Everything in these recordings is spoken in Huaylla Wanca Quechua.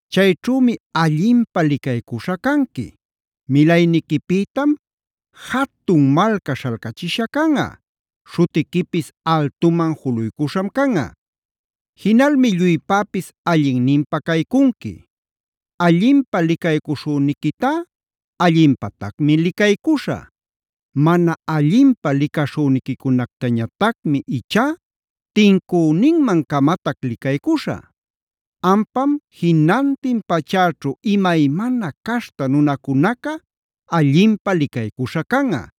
Chayćhümi allinpä licaycuśha canqui; milayniquipïtam jatun malca śhalcachishä canꞌa; śhutiquipis altuman juluycuśham canꞌa. Jinalmi lluypäpis allinninpä caycunqui. Allinpä licaycuśhüniquitá allinpatacmi licaycuśhä; mana allinpä licaśhüniquicunactañatacmi ichá tincüninman-camatac licaycuśhä. ¡Ampam jinantin pachäćhu imaymana caśhta nunacunaca allinpä licaycuśhä canꞌa!”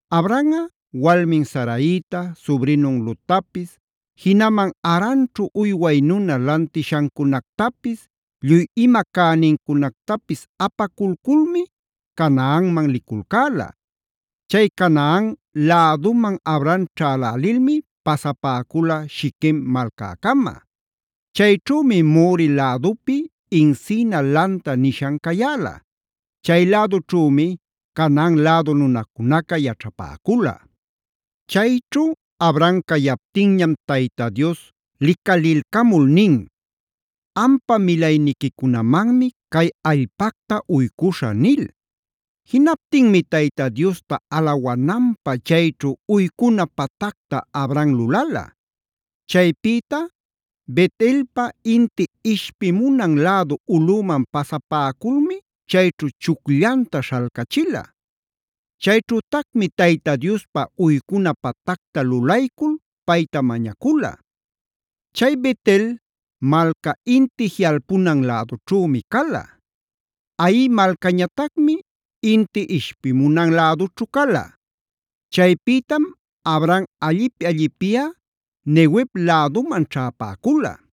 Abramꞌa walmin Saraita, subrinun Lottapis, jinaman Haranćhu uyway nuna lantishancunactapis, lluy ima cänincunactapis apaculculmi Canaanman liculcäla. Chay Canaan läduman Abram ćhälälilmi pasapäcula Shiquem malcäcama. Chayćhümi More lädupi “encina” lanta nishan cayäla. Chay lädućhümi Canaan lädu nunacunaca yaćhapäcula. Chayćhu Abram cayaptinñam Tayta Dios licalilcamul nin: “Ampa milayniquicunamanmi cay allpacta uycuśhä” nil.c Jinaptinmi Tayta Diosta alawananpä chayćhu uycuna patacta Abram lulala. Chaypïta Bet-elpa inti ishpimunan lädu ulꞌüman pasapäculmi chayćhu chucllanta śhalcachila. Chayćhütacmi Tayta Diospa uycuna patacta lulaycul payta mañacula. Chay Bet-el malca inti jiꞌalpunan lädućhümi cala; Hai malcañatacmi inti ishpimunan lädućhu cala. Chaypïtam Abram allipi-allipiꞌa Neguev läduman ćhäpäcula.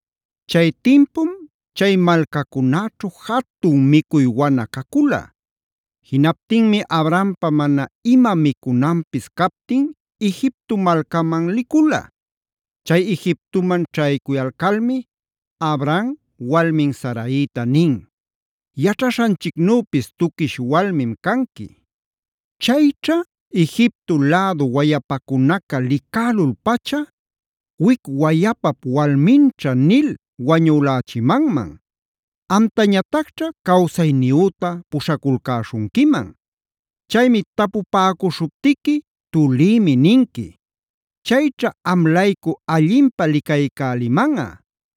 Chay timpum chay malcacunäćhu jatun micuy wana cacula. Jinaptinmi Abrampa mana ima micunanpis captin Egipto malcaman licula. Chay Egiptoman ćhaycuyalcalmi Abram walmin Saraita nin: “Yaćhaśhanchicnüpis tuquish walmim canqui. Chayćha Egipto lädu wayapacunaca licälul-pacha ‘wic wayapap walminćha’ nil wañülächimanman; amtañatacćha cawsayniyüta puśhaculcäśhunquiman. Chaymi tapupäcuśhuptiqui ‘tulïmi’ ninqui. Chayćha am-laycu allinpä licaycälimanꞌa,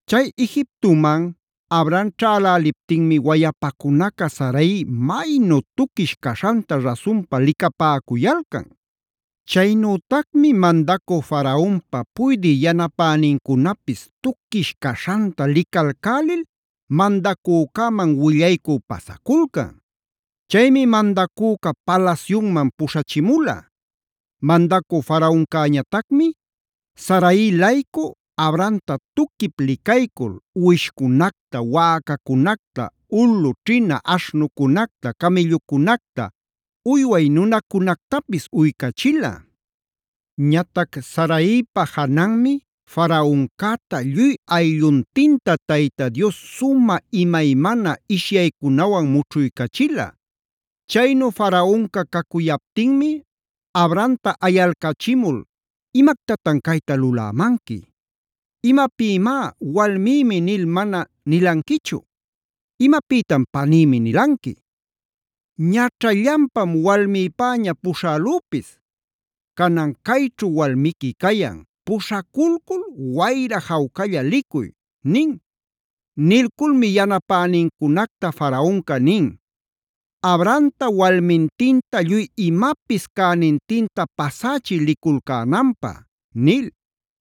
Chay Egiptoman Abram ćhäläliptinmi wayapacunaca Sarai maynu tuquish caśhanta rasunpa licapäcuyalcan. Chaynütacmi mandacü Faraonpa puydï yanapänincunapis tuquish caśhanta licalcälil mandacücäman willaycü pasaculcan. Chaymi mandacüca palasyunman puśhachimula. Mandacü Faraoncäñatacmi Sarai-laycu Abramta tuquip licaycul uwishcunacta, wäcacunacta, ulu ćhina aśhnucunacta, camïllucunacta, uyway nunacunactapis uycachila. Ñatac Saraipa jananmi Faraoncäta lluy aylluntinta Tayta Dios sumä imaymana ishyaycunawan mućhuycachila. Chaynu Faraonca cacuyaptinmi Abramta ayalcachimul: “¿Imactatan cayta lulämanqui? ¿Imapïmá ‘walmïmi’ nil mana nilanquichu? ¿Imapïtam ‘panïmi’ nilanqui? Ñaćhallanpam walmïpäña puśhälüpis. Canan cayćhu walmiqui cayan, puśhaculcul wayra jawcalla licuy” nin. Nilculmi yanapänincunacta Faraonca nin: “Abramta walmintinta lluy imapis cänintinta pasächiy liculcänanpä” nil.